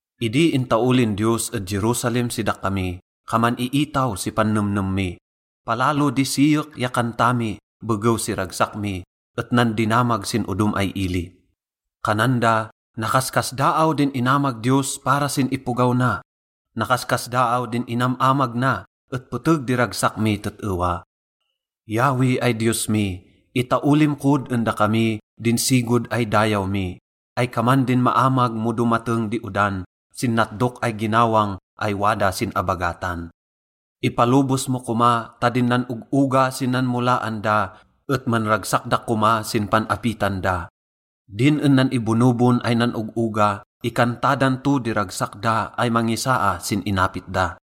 Idi intaolin Diyos ed Jerusalem si dakami, kaman iitaw si pannemnem mi. Palalo di siyek ya kanta mi begew si ragsak mi et nandinamag sin odom ay ili. Kanan da, “Nakaskasdaaw din inamag Diyos para sin ipogaw na.” Nakaskasdaaw din inam-amag na et peteg di ragsak mi tet-ewa. Yahweh ay Diyos mi, itaolim kod en dakami din sigod ay dayaw mi, ay kaman din maamag mo domateng di odan sin natdok ay ginawang ay wada sin abagatan. Ipalobos mo koma ta din nan-og-oga sin nanmolaan da et manragsak da koma sin pan-apitan da. Din en nan-ibonobon ay nan-og-oga, ikanta dan to di ragsak da ay mangisaa sin inapit da.